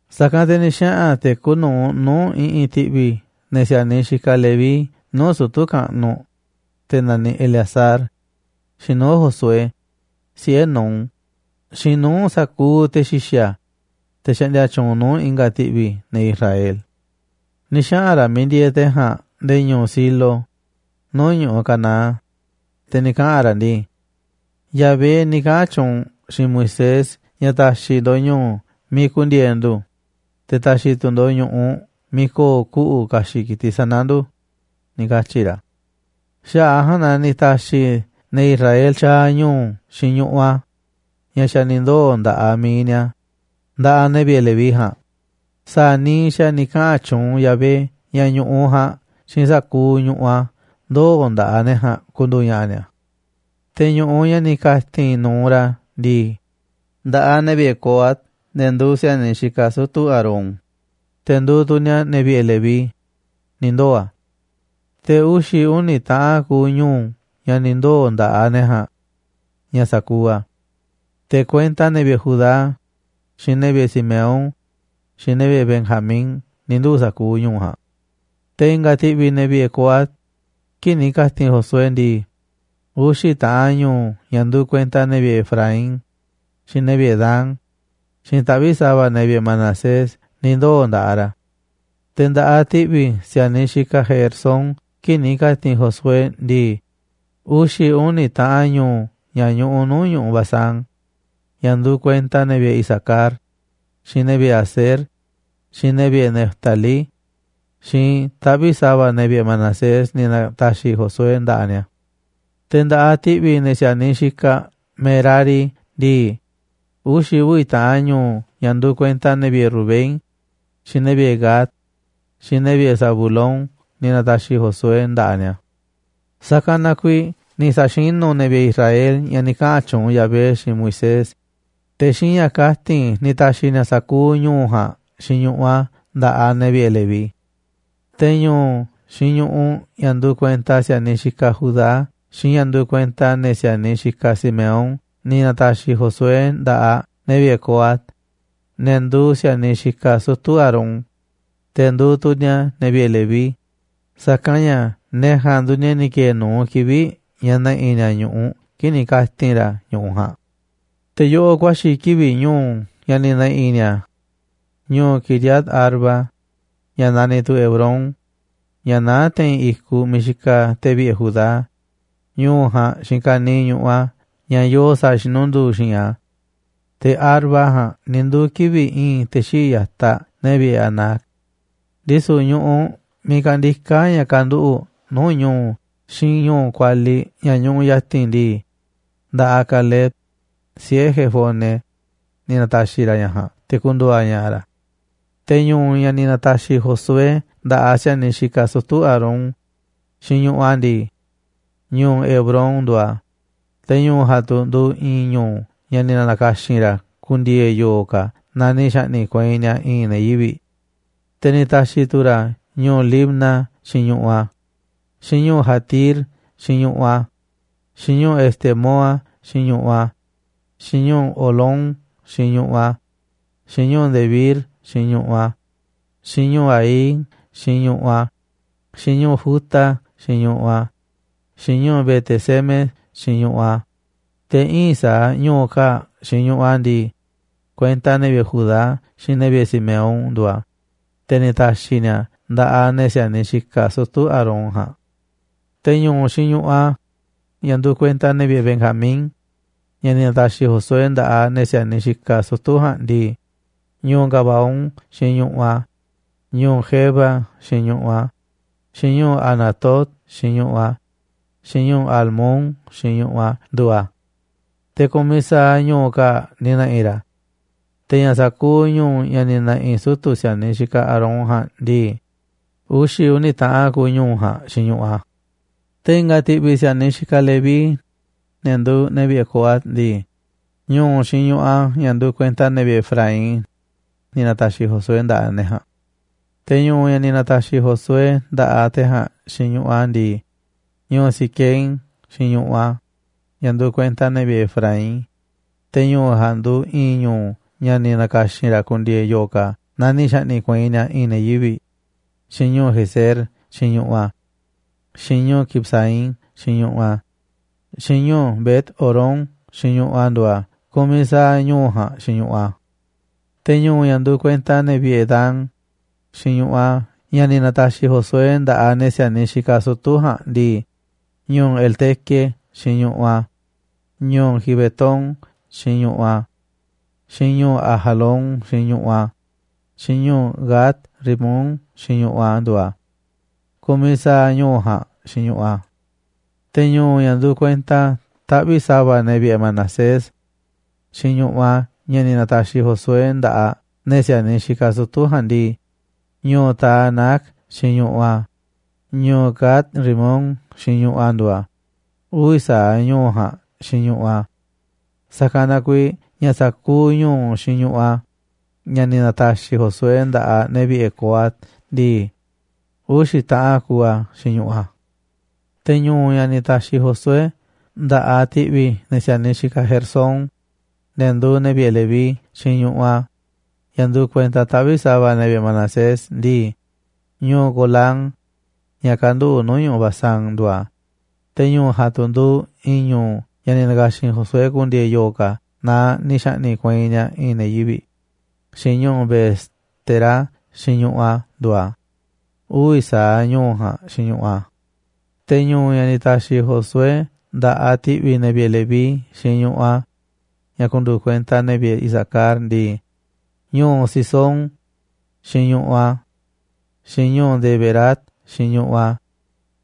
Sa̱kanꞌ te̱ ni̱ xaꞌa̱n te̱ kuuꞌ nu̱uꞌ nuu̱ꞌ i̱ꞌi̱n ti̱ꞌvi̱ ne̱ si̱a̱niꞌ xikaꞌ Leví nuu̱ꞌ sutu̱ kaꞌnuꞌ, te̱ naniꞌ Eleazar, xiinꞌ nuu̱ꞌ Josué, siꞌe̱ Nun, xiinꞌ nuu̱ꞌ sa̱kuuꞌ te̱ xi̱xa̱, te̱ xaꞌndia tyuunꞌ nuu̱ꞌ i̱nga̱ ti̱ꞌvi̱ ne̱ Israel. Ni̱ xaꞌa̱n ra̱ miiꞌ ndieeꞌ te̱ ja̱a̱nꞌ nde̱e̱ ñu̱u̱ Silo nuu̱ꞌ ñu̱ꞌuꞌ Canaán, te̱ ni̱ kaꞌa̱n ra̱ ndii: ―Yahvé ni̱ kaꞌa̱n tyuunꞌ xiinꞌ Moisés ña̱ ta̱xi̱ ndo̱ꞌ ñu̱u̱ miiꞌ ku̱ndi̱e̱e̱ ndu̱, te̱ ta̱xi̱ tu̱ ndo̱ꞌ ñu̱ꞌuꞌ a̱ miiꞌ ko̱o̱ kuꞌu̱ ka̱xi̱ꞌ ki̱tiꞌ sana̱ ndu̱ ―ni̱ katyi̱ ra̱. Xaꞌa̱ꞌ a̱ ja̱a̱nꞌ na ni̱ ta̱xi̱ ne̱ Israel tyaaꞌ ñu̱u̱ xiinꞌ ñu̱ꞌuꞌ a̱, ña̱ xa̱ ni̱ ndoo̱ nda̱ꞌaꞌ mi̱iꞌ ni̱a̱, nda̱ꞌaꞌ ne̱ vi̱ꞌe̱ Leví ja̱a̱nꞌ sa̱a̱ niiꞌ xa̱ ni̱ kaꞌa̱n tyuunꞌ Yahvé ña̱ ñu̱ꞌuꞌ ja̱a̱nꞌ xiinꞌ sa̱kuuꞌ ñu̱ꞌuꞌ a̱ ndoo̱ nda̱ꞌaꞌ ne̱ ja̱a̱nꞌ ku̱ndu̱u̱ ña̱ꞌa̱ ni̱a̱. Te̱ ñu̱ꞌuꞌ ña̱ ni̱ ka̱ti̱n nu̱uꞌ ra̱ ndii, nda̱ꞌaꞌ ne̱ vi̱ꞌe̱ Coat, ne̱ nduuꞌ si̱a̱niꞌ xikaꞌ sutu̱ Aarón, te̱ nduuꞌ tu̱ ni̱a̱ ne̱ vi̱ꞌe̱ Leví, ni̱ ndoo̱ a̱. Te̱ uxi̱ uni̱ taꞌan kuuꞌ ñu̱u̱ ña̱ ni̱ ndoo̱ nda̱ꞌaꞌ ne̱ ja̱a̱nꞌ ña̱ sa̱kuuꞌ a̱, te̱ kuenta ne̱ vi̱ꞌe̱ Judá, xiinꞌ ne̱ vi̱ꞌe̱ Simeón, xiinꞌ ne̱ vi̱ꞌe̱ Benjamín ni̱ nduu̱ sa̱kuuꞌ ñu̱u̱ ja̱a̱nꞌ. Te̱ i̱nga̱ ti̱ꞌvi̱ ne̱ vi̱ꞌe̱ Coat kii̱ꞌ ni̱ ka̱ti̱n Josué ndii, uxi̱ taꞌan ñu̱u̱ ña̱ nduuꞌ kuenta ne̱ vi̱ꞌe̱ Efraín, xiinꞌ ne̱ vi̱ꞌe̱ Dan, xiinꞌ taꞌvi̱ꞌ sa̱va̱ ne̱ vi̱ꞌe̱ Manasés ni̱ ndoo̱ nda̱ꞌaꞌ ni̱a̱. Te̱ nda̱ꞌaꞌ ti̱ꞌvi̱ ne̱ si̱a̱niꞌ xikaꞌ Gersón kii̱ꞌ ni̱ ka̱ti̱n Josué ndii, uxi̱ uni̱ taꞌan ñu̱u̱ ña̱ ñuꞌuꞌ nuu̱ꞌ ñu̱ꞌuꞌ Basán, ña̱ nduuꞌ kuenta ne̱ vi̱ꞌe̱ Isacar, xiinꞌ ne̱ vi̱ꞌe̱ Aser, xiinꞌ ne̱ vi̱ꞌe̱ Neftalí, xiinꞌ taꞌvi̱ꞌ sa̱va̱ ne̱ vi̱ꞌe̱ Manasés ni̱ na̱ta̱xi̱ Josué nda̱ꞌaꞌ ni̱a̱. Te̱ nda̱ꞌaꞌ ti̱ꞌvi̱ ne̱ si̱a̱niꞌ xikaꞌ Merari ndii, uxi̱ uvi̱ taꞌan ñu̱u̱ ña̱ nduuꞌ kuenta ne̱ vi̱ꞌe̱ Rubén, xiinꞌ ne̱ vi̱ꞌe̱ Gad, xiinꞌ ne̱ vi̱ꞌe̱ Zabulón ni̱ na̱ta̱xi̱ Josué nda̱ꞌaꞌ ni̱a̱. Sa̱kanꞌ na kuiiꞌ ni̱ sa̱xinu̱ ne̱ vi̱ꞌe̱ Israel ña̱ ni̱ kaꞌa̱n tyuunꞌ Yahvé xiinꞌ Moisés, te̱ xiinꞌ ña̱ kati̱n ni̱ ta̱xi̱ ni̱a̱ sa̱kuuꞌ ñu̱u̱ ja̱a̱nꞌ xiinꞌ ñu̱ꞌuꞌ a̱ nda̱ꞌaꞌ ne̱ vi̱ꞌe̱ Leví. Te̱ ñu̱u̱ xiinꞌ ñu̱ꞌuꞌ ña̱ nduuꞌ kuenta si̱a̱niꞌ xikaꞌ Judá xiinꞌ ña̱ nduuꞌ kuenta ne̱ si̱a̱niꞌ xikaꞌ Simeón ni̱ na̱ta̱xi̱ Josué nda̱ꞌaꞌ ne̱ vi̱ꞌe̱ Coat, ne̱ nduuꞌ si̱a̱niꞌ xikaꞌ sutu̱ Aarón, te̱ nduuꞌ tu̱ ni̱a̱ ne̱ vi̱ꞌe̱ Leví, sa̱kanꞌ ña̱ ne̱ ja̱a̱nꞌ nduuꞌ ne̱ ni̱ ki̱e̱e̱ nu̱uꞌ kivi̱ꞌ ña̱ ne̱ꞌi̱ ni̱a̱ ñu̱ꞌuꞌ kii̱ꞌ ni̱ ka̱ti̱n ra̱ ñu̱ꞌuꞌ ja̱a̱nꞌ. Te̱ yoꞌoꞌ ku̱a̱xi̱ kivi̱ꞌ ñu̱u̱ ña̱ ni̱ ne̱ꞌi̱ ni̱a̱: ñu̱u̱ Quiriat-arba, ña̱ naniꞌ tu̱ Hebrón, ña̱ naá te̱i̱n i̱kuꞌ miiꞌ xikaꞌ ne̱ vi̱ꞌe̱ Judá, ñu̱u̱ ja̱a̱nꞌ xiinꞌ ka̱niiꞌ ñu̱ꞌuꞌ ña̱ yoo sa̱a̱ xinunduu xi̱i̱nꞌ a̱. Te̱ Arba ja̱a̱nꞌ ni̱ nduu̱ kivi̱ꞌ i̱i̱n te̱ xii̱ꞌ ya̱taꞌ ne̱ vi̱ꞌe̱ Anac. Ndisu̱ ñu̱ꞌuꞌ miiꞌ kandiká ña̱ kanduꞌu̱ꞌ nuu̱ꞌ ñu̱u̱ xiinꞌ ñu̱u̱ kualiꞌ ña̱ ñuꞌuꞌ ya̱ti̱n ndii, nda̱ꞌaꞌ Caleb, siꞌe̱ Jefone, ni̱ na̱ta̱xi̱ ra̱ ña̱ ja̱a̱nꞌ te̱ ku̱ndu̱u̱ a̱ ña̱ꞌa̱ ra̱. Te̱ ñu̱u̱ ña̱ ni̱ na̱ta̱xi̱ Josué nda̱ꞌaꞌ ne̱ si̱a̱niꞌ xikaꞌ sutu̱ Aarón, xiinꞌ ñu̱ꞌuꞌ a̱ ndii: ñu̱u̱ Hebrón nduuꞌ a̱. Te̱ ñu̱u̱ ja̱a̱nꞌ tu̱ nduuꞌ i̱i̱n ñu̱u̱ ña̱ ni̱ na̱ka̱xi̱n ra̱ ku̱ndi̱e̱e̱ yo̱o̱ ka̱ naaꞌ ni̱ xa̱ꞌni̱ꞌ kueinꞌ ni̱a̱ i̱i̱n ne̱ yivi̱ꞌ. Te̱ ni̱ ta̱xi̱ tu̱ ra̱ ñu̱u̱ Libna xiinꞌ ñu̱ꞌuꞌ a̱, xiinꞌ ñu̱u̱ Jatir xiinꞌ ñu̱ꞌuꞌ a̱, xiinꞌ ñu̱u̱ Estemoa xiinꞌ ñu̱ꞌuꞌ a̱, xiinꞌ ñu̱u̱ Holón xiinꞌ ñu̱ꞌuꞌ a̱, xiinꞌ ñu̱u̱ Debir xiinꞌ ñu̱ꞌuꞌ a̱, xiinꞌ ñu̱u̱ Aín xiinꞌ ñu̱ꞌuꞌ a̱, xiinꞌ ñu̱u̱ Juta xiinꞌ ñu̱ꞌuꞌ a̱, xiinꞌ ñu̱u̱ Bet-semes xiinꞌ ñu̱ꞌuꞌ a̱. Te̱ íin sa̱aꞌ ñu̱u̱ kaa̱ꞌ xiinꞌ ñu̱ꞌuꞌ a̱ ndii, kuenta ne̱ vi̱ꞌe̱ Judá xiinꞌ ne̱ vi̱ꞌe̱ Simeón nduuꞌ a̱, te̱ ni̱ ta̱xi̱ ni̱a̱ a̱ nda̱ꞌaꞌ ne̱ si̱a̱niꞌ xikaꞌ sutu̱ Aarón ja̱a̱nꞌ. Te̱ ñu̱u̱ xiinꞌ ñu̱ꞌuꞌ a̱, ña̱ nduuꞌ kuenta ne̱ vi̱ꞌe̱ Benjamín, ña̱ ni̱ na̱ta̱xi̱ Josué nda̱ꞌaꞌ ne̱ si̱a̱niꞌ xikaꞌ sutu̱ ja̱a̱nꞌ ndii, ñu̱u̱ Gabaón xiinꞌ ñu̱ꞌuꞌ a̱, xiinꞌ ñu̱u̱ Geba xiinꞌ ñu̱ꞌuꞌ a̱, xiinꞌ ñu̱u̱ Anatot xiinꞌ ñu̱ꞌuꞌ a̱, xiinꞌ ñu̱u̱ Almón xiinꞌ ñu̱ꞌuꞌ a̱ nduuꞌ a̱, te̱ ku̱miꞌ saaꞌ ñu̱u̱ kaa̱ꞌ ni̱ ne̱ꞌi̱ ra̱. Te̱ ña̱ sa̱kuuꞌ ñu̱u̱ ña̱ ni̱ ne̱ꞌi̱ sutu̱ si̱a̱niꞌ xikaꞌ Aarón ja̱a̱nꞌ ndii, uxi̱ uni̱ taꞌan kuuꞌ ñu̱u̱ ja̱a̱nꞌ xiinꞌ ñu̱ꞌuꞌ a̱. Te̱ i̱nga̱ ti̱ꞌvi̱ si̱a̱niꞌ xikaꞌ Leví, ne̱ nduuꞌ ne̱ vi̱ꞌe̱ Coat ndii, ñu̱u̱ xiinꞌ ñu̱ꞌuꞌ a̱, ña̱ nduuꞌ kuenta ne̱ vi̱ꞌe̱ Efraín, ni̱ na̱ta̱xi̱ Josué nda̱ꞌaꞌ ne̱ ja̱a̱nꞌ. Te̱ ñu̱u̱ ña̱ ni̱ na̱ta̱xi̱ Josué nda̱ꞌaꞌ te̱ ja̱a̱nꞌ xiinꞌ ñu̱ꞌuꞌ a̱ ndii, ñu̱u̱ Siquem xiinꞌ ñu̱ꞌuꞌ a̱, ña̱ nduuꞌ kuenta ne̱ vi̱ꞌe̱ Efraín, te̱ ñu̱u̱ ja̱a̱nꞌ tu̱ nduuꞌ i̱i̱n ñu̱u̱ ña̱ ni̱ na̱ka̱xi̱n ra̱ ku̱ndi̱e̱e̱ yo̱o̱ ka̱ naaꞌ ni̱ xa̱ꞌni̱ꞌ kueinꞌ ni̱a̱ i̱i̱n ne̱ yivi̱ꞌ, xiinꞌ ñu̱u̱ Gezer xiinꞌ ñu̱ꞌuꞌ a̱. xiinꞌ ñu̱u̱ Kibsaim xiinꞌ ñu̱ꞌuꞌ a̱, xiinꞌ ñu̱u̱ Bet-horón xiinꞌ ñu̱ꞌuꞌ a̱ nduuꞌ a̱, ku̱miꞌ sa̱aꞌ ñu̱u̱ ja̱a̱nꞌ xiinꞌ ñu̱ꞌuꞌ a̱. Te̱ ñu̱u̱ ña̱ nduuꞌ kuenta ne̱ vi̱ꞌe̱ Dan xiinꞌ ñu̱ꞌuꞌ a̱ ña̱ ni̱ na̱ta̱xi̱ Josué nda̱ꞌaꞌ ne̱ si̱a̱niꞌ xikaꞌ sutu̱ ja̱a̱nꞌ ndii, ñu̱u̱ Elteque xiinꞌ ñu̱ꞌuꞌ a̱, xiinꞌ ñu̱u̱ Gibetón xiinꞌ ñu̱ꞌuꞌ a̱, xiinꞌ ñu̱u̱ Ajalón xiinꞌ ñu̱ꞌuꞌ a̱, xiinꞌ ñu̱u̱ Gat-rimón xiinꞌ ñu̱ꞌuꞌ a̱ nduuꞌ a̱. Ku̱miꞌ sa̱aꞌ ñu̱u̱ ja̱a̱nꞌ xiinꞌ ñu̱ꞌuꞌ a̱. Te̱ ñu̱u̱ ña̱ nduuꞌ kuenta taꞌvi̱ꞌ sa̱va̱ ne̱ vi̱ꞌe̱ Manasés xiinꞌ ñu̱ꞌuꞌ a̱, ña̱ ni̱ na̱ta̱xi̱ Josué nda̱ꞌaꞌ ne̱ si̱a̱niꞌ xikaꞌ sutu̱ ja̱a̱nꞌ ndii, ñu̱u̱ Taanac xiinꞌ ñu̱ꞌuꞌ a̱, xiinꞌ ñu̱u̱ Gat-rimón xiinꞌ ñu̱ꞌuꞌ a̱ nduuꞌ a̱, uvi̱ sa̱aꞌ ñu̱u̱ ja̱a̱nꞌ xiinꞌ ñu̱ꞌuꞌ a̱. Sa̱kanꞌ na kuiiꞌ ña̱ sa̱kuuꞌ ñu̱u̱ xiinꞌ ñu̱ꞌuꞌ a̱, ña̱ ni̱ na̱ta̱xi̱ Josué nda̱ꞌaꞌ ne̱ vi̱ꞌe̱ Coat ndii, uxi̱ taꞌan kuuꞌ a̱ xiinꞌ ñu̱ꞌuꞌ a̱. Te̱ ñu̱u̱ ña̱ ni̱ ta̱xi̱ Josué nda̱ꞌaꞌ ti̱ꞌvi̱ ne̱ si̱a̱niꞌ xikaꞌ Gersón, ne̱ nduuꞌ ne̱ vi̱ꞌe̱ Leví xiinꞌ ñu̱ꞌuꞌ a̱, ña̱ nduuꞌ kuenta taꞌvi̱ꞌ sa̱va̱ ne̱ vi̱ꞌe̱ Manasés ndii, ñu̱u̱ Golán, ña̱ kanduꞌu̱ꞌ nuu̱ꞌ ñu̱ꞌuꞌ Basán, nduuꞌ a̱, te̱ ñu̱u̱ ja̱a̱nꞌ tu̱ nduuꞌ i̱i̱n ñu̱u̱ ña̱ ni̱ na̱ka̱xi̱n Josué ku̱ndi̱e̱e̱ yo̱o̱ ka̱ naaꞌ ni̱ xa̱ꞌni̱ꞌ kueinꞌ ni̱a̱ i̱i̱n ne̱ yivi̱ꞌ, xiinꞌ ñu̱u̱ Beestera xiinꞌ ñu̱ꞌuꞌ a̱ nduuꞌ a̱, uvi̱ sa̱aꞌ ñu̱u̱ ja̱a̱nꞌ xiinꞌ ñu̱ꞌuꞌ a̱. Te̱ ñu̱u̱, ña̱ ni̱ ta̱xi̱ Josué nda̱ꞌaꞌ ti̱ꞌvi̱ ne̱ vi̱ꞌe̱ Leví xiinꞌ ñu̱ꞌuꞌ a̱, ña̱ nduuꞌ kuenta ne̱ vi̱ꞌe̱ Isacar ndii, ñu̱u̱ Cisón xiinꞌ ñu̱ꞌuꞌ a̱, xiinꞌ ñu̱u̱ Daberat xiinꞌ ñu̱ꞌuꞌ a̱,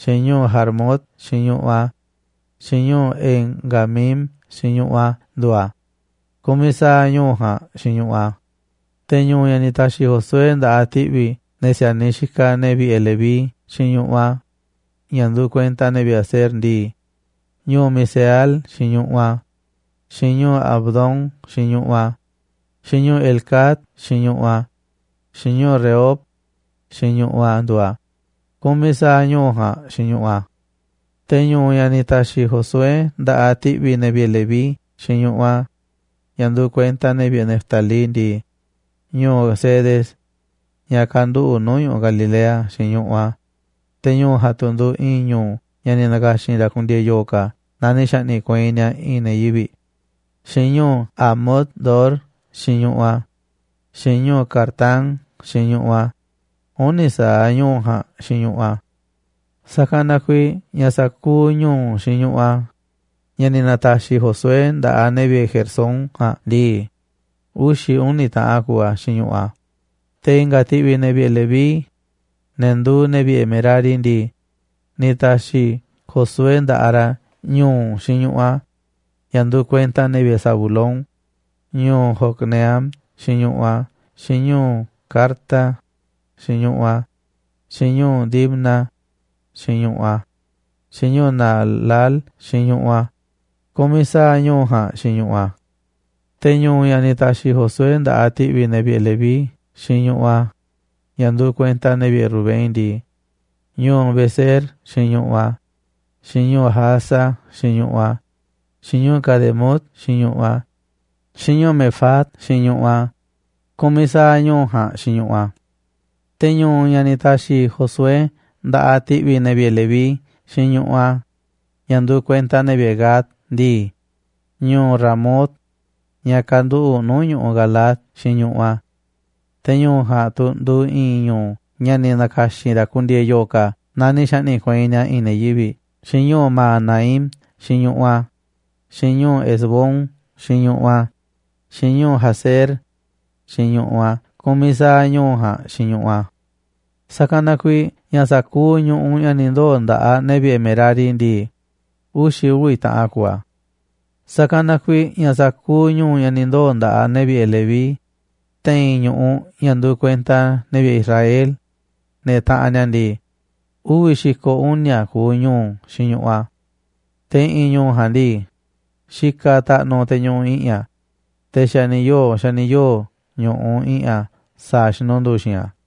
xiinꞌ ñu̱u̱ Jarmut xiinꞌ ñu̱ꞌuꞌ a̱, xiinꞌ ñu̱u̱ En-ganim xiinꞌ ñu̱ꞌuꞌ a̱ nduuꞌ a̱, ku̱miꞌ sa̱aꞌ ñu̱u̱ ja̱a̱nꞌ xiinꞌ ñu̱ꞌuꞌ a̱. Te̱ ñu̱u̱ ña̱ ni̱ ta̱xi̱ Josué nda̱ꞌaꞌ ti̱ꞌvi̱ ne̱ si̱a̱niꞌ xikaꞌ ne̱ vi̱ꞌe̱ Leví xiinꞌ ñu̱ꞌuꞌ a̱, ña̱ nduuꞌ kuenta ne̱ vi̱ꞌe̱ Aser ndii, ñu̱u̱ Miseal xiinꞌ ñu̱ꞌuꞌ a̱, xiinꞌ ñu̱u̱ Abdón xiinꞌ ñu̱ꞌuꞌ a̱, xiinꞌ ñu̱u̱ Helcat xiinꞌ ñu̱ꞌuꞌ a̱, xiinꞌ ñu̱u̱ Rehob xiinꞌ ñu̱ꞌuꞌ a̱ nduuꞌ a̱, ku̱miꞌ sa̱aꞌ ñu̱u̱ ja̱a̱nꞌ xiinꞌ ñu̱ꞌuꞌ a̱. Te̱ ñu̱u̱ ña̱ ni̱ ta̱xi̱ Josué nda̱ꞌaꞌ ti̱ꞌvi̱ ne̱ vi̱ꞌe̱ Leví xiinꞌ ñu̱ꞌuꞌ a̱, ña̱ nduuꞌ kuenta ne̱ vi̱ꞌe̱ Neftalí ndii, ñu̱u̱ Cedes, ña̱ kanduꞌu̱ꞌ nuu̱ꞌ ñu̱ꞌuꞌ Galilea, xiinꞌ ñu̱ꞌuꞌ a̱, te̱ ñu̱u̱ ja̱a̱nꞌ tu̱ nduuꞌ i̱i̱n ñu̱u̱ ña̱ ni̱ na̱ka̱xi̱n ra̱ ku̱ndi̱e̱e̱ yo̱o̱ ka̱ naaꞌ ni̱ xa̱ꞌni̱ꞌ kueinꞌ ni̱a̱ i̱i̱n ne̱ yivi̱ꞌ, xiinꞌ ñu̱u̱ Hamot-dor xiinꞌ ñu̱ꞌuꞌ a̱, xiinꞌ ñu̱u̱ Cartán xiinꞌ ñu̱ꞌuꞌ a̱, uni̱ sa̱aꞌ ñu̱u̱ ja̱a̱nꞌ xiinꞌ ñu̱ꞌuꞌ a̱. Sa̱kanꞌ na kuiiꞌ ña̱ sa̱kuuꞌ ñu̱u̱ xiinꞌ ñu̱ꞌuꞌ a̱, ña̱ ni̱ na̱ta̱xi̱ Josué nda̱ꞌaꞌ ne̱ vi̱ꞌe̱ Gersón ja̱a̱nꞌ ndii, uxi̱ uni̱ taꞌan kuuꞌ a̱ xiinꞌ ñu̱ꞌuꞌ a̱. Te̱ i̱nga̱ ti̱ꞌvi̱ ne̱ vi̱ꞌe̱ Leví, ne̱ nduuꞌ ne̱ vi̱ꞌe̱ Merari ndii, ni̱ ta̱xi̱ Josué nda̱ꞌaꞌ ra̱ ñu̱u̱ xiinꞌ ñu̱ꞌuꞌ, ña̱ nduuꞌ kuenta ne̱ vi̱ꞌe̱ Zabulón, ñu̱u̱ Jocneam xiinꞌ ñu̱ꞌuꞌ a̱, xiinꞌ ñu̱u̱ Carta xiinꞌ ñu̱ꞌuꞌ a̱, xiinꞌ ñu̱u̱ Dimna xiinꞌ ñu̱ꞌuꞌ a̱, xiinꞌ ñu̱u̱ Naalal xiinꞌ ñu̱ꞌuꞌ a̱, ku̱miꞌ sa̱aꞌ ñu̱u̱ ja̱a̱nꞌ xiinꞌ ñu̱ꞌuꞌ a̱. Te̱ ñu̱u̱ ña̱ ni̱ ta̱xi̱ Josué nda̱ꞌaꞌ ti̱ꞌvi̱ ne̱ vi̱ꞌe̱ Leví xiinꞌ ñu̱ꞌuꞌ a̱, ña̱ nduuꞌ kuenta ne̱ vi̱ꞌe̱ Rubén ndii, ñu̱u̱ Beser xiinꞌ ñu̱ꞌuꞌ a̱, xiinꞌ ñu̱u̱ Jahaza xiinꞌ ñu̱ꞌuꞌ a̱, xiinꞌ ñu̱u̱ Cademot xiinꞌ ñu̱ꞌuꞌ a̱, xiinꞌ ñu̱u̱ Mefaat xiinꞌ ñu̱ꞌuꞌ a̱, ku̱miꞌ sa̱aꞌ ñu̱u̱ ja̱a̱nꞌ xiinꞌ ñu̱ꞌuꞌ a̱. Te̱ ñu̱u̱ ña̱ ni̱ ta̱xi̱ Josué nda̱ꞌaꞌ ti̱ꞌvi̱ ne̱ vi̱ꞌe̱ Leví xiinꞌ ñu̱ꞌuꞌ a̱, ña̱ nduuꞌ kuenta ne̱ vi̱ꞌe̱ Gad ndii, ñu̱u̱ Ramot, ña̱ kanduꞌu̱ꞌ nuu̱ꞌ ñu̱ꞌuꞌ Galaad xiinꞌ ñu̱ꞌuꞌ a̱. Te̱ ñu̱u̱ ja̱a̱nꞌ tu̱ nduuꞌ i̱i̱n ñu̱u̱ ña̱ ni̱ na̱ka̱xi̱n ra̱ ku̱ndi̱e̱e̱ yo̱o̱ ka̱ naaꞌ ni̱ xa̱ꞌni̱ꞌ kueinꞌ ni̱a̱ i̱i̱n ne̱ yivi̱ꞌ, xiinꞌ ñu̱u̱ Mahanaim xiinꞌ ñu̱ꞌuꞌ a̱, xiinꞌ ñu̱u̱ Hesbón xiinꞌ ñu̱ꞌuꞌ a̱, xiinꞌ ñu̱u̱ Jazer xiinꞌ ñu̱ꞌuꞌ a̱, ku̱miꞌ sa̱aꞌ ñu̱u̱ ja̱a̱nꞌ xiinꞌ ñu̱ꞌuꞌ a̱. Sa̱kanꞌ na kuiiꞌ ña̱ sa̱kuuꞌ ñu̱ꞌuꞌ ña̱ ni̱ ndoo̱ nda̱ꞌaꞌ ne̱ vi̱ꞌe̱ Merari ndii, uxi̱ uvi̱ taꞌan kuuꞌ a̱. Sa̱kanꞌ na kuiiꞌ ña̱ sa̱kuuꞌ ñu̱u̱ ña̱ ni̱ ndoo̱ nda̱ꞌaꞌ ne̱ vi̱ꞌe̱ Leví te̱i̱n ñu̱ꞌuꞌ, ña̱ nduuꞌ kuenta ne̱ vi̱ꞌe̱ Israel, ne̱ taꞌanꞌ ni̱a̱ ndii, uvi̱ xi̱ko̱ uni̱a̱ kuuꞌ ñu̱u̱ xiinꞌ ñu̱ꞌuꞌ a̱. Te̱ i̱ꞌi̱n ñu̱u̱ ja̱a̱nꞌ ndii, xikaꞌ taꞌnuꞌ te̱ ñuꞌuꞌ i̱ꞌi̱n a̱, te̱ xa̱ ni̱ yoo̱ xa̱ ni̱ yoo̱ ñu̱ꞌuꞌ i̱ꞌi̱n a̱ sa̱a̱ xinunduu xi̱i̱nꞌ a̱.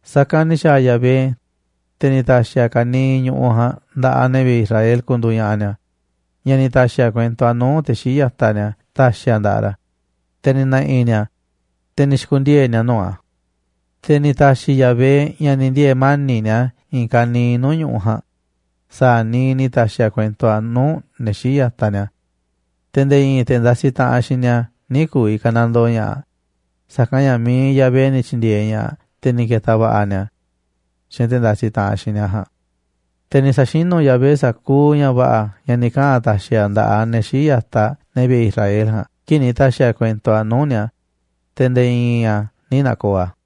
Sa̱kanꞌ ni̱ xa̱a̱ Yahvé, te̱ ni̱ ta̱xi̱ a̱ ka̱niiꞌ ñu̱ꞌuꞌ ja̱a̱nꞌ nda̱ꞌaꞌ ne̱ vi̱ꞌe̱ Israel ku̱ndu̱u̱ ña̱ꞌa̱ ni̱a̱, ña̱ ni̱ ta̱xi̱ a̱ kuento nuu̱ꞌ te̱ xii̱ꞌ ya̱taꞌ ni̱a̱ ta̱xi̱ a̱ nda̱ꞌaꞌ ra̱, te̱ ni̱ ne̱ꞌi̱ ni̱a̱ a̱, te̱ ni̱ xi̱ku̱ndiee̱ ni̱a̱ nuu̱ꞌ a̱. Te̱ ni̱ ta̱xi̱ Yahvé ña̱ ni̱ ndiee̱ mani̱ꞌ ni̱a̱ i̱i̱n ka̱niiꞌ nuu̱ꞌ ñu̱ꞌuꞌ ja̱a̱nꞌ sa̱a̱ niiꞌ ni̱ ta̱xi̱ a̱ kuento a̱ nuu̱ꞌ ne̱ xii̱ꞌ ya̱taꞌ ni̱a̱. Te̱ nde̱e̱ i̱i̱n te̱ ndasiꞌ taꞌanꞌ xiinꞌ ni̱a̱ nï̱ ku̱vi̱ ka̱nandoo ña̱ꞌaꞌ, sa̱kanꞌ ña̱ mi̱iꞌ Yahvé ni̱ tyi̱ndi̱e̱eꞌ ña̱ꞌaꞌ, te̱ ni̱ ke̱ta̱ va̱ꞌa̱ ni̱a̱ xiinꞌ te̱ ndasiꞌ taꞌanꞌ xiinꞌ ni̱a̱ ja̱a̱nꞌ. Te̱ ni̱ sa̱xinu̱ Yahvé sa̱kuuꞌ ña̱ va̱ꞌa̱ ña̱ ni̱ kaꞌa̱n a̱ ta̱xi̱ a̱ nda̱ꞌaꞌ ne̱ xii̱ꞌ ya̱taꞌ ne̱ vi̱ꞌe̱ Israel ja̱a̱nꞌ kii̱ꞌ ni̱ ta̱xi̱ a̱ kuento a̱ nuu̱ꞌ ni̱a̱, te̱ nde̱e̱ i̱i̱n a̱ nï̱ na̱ko̱o̱ a̱.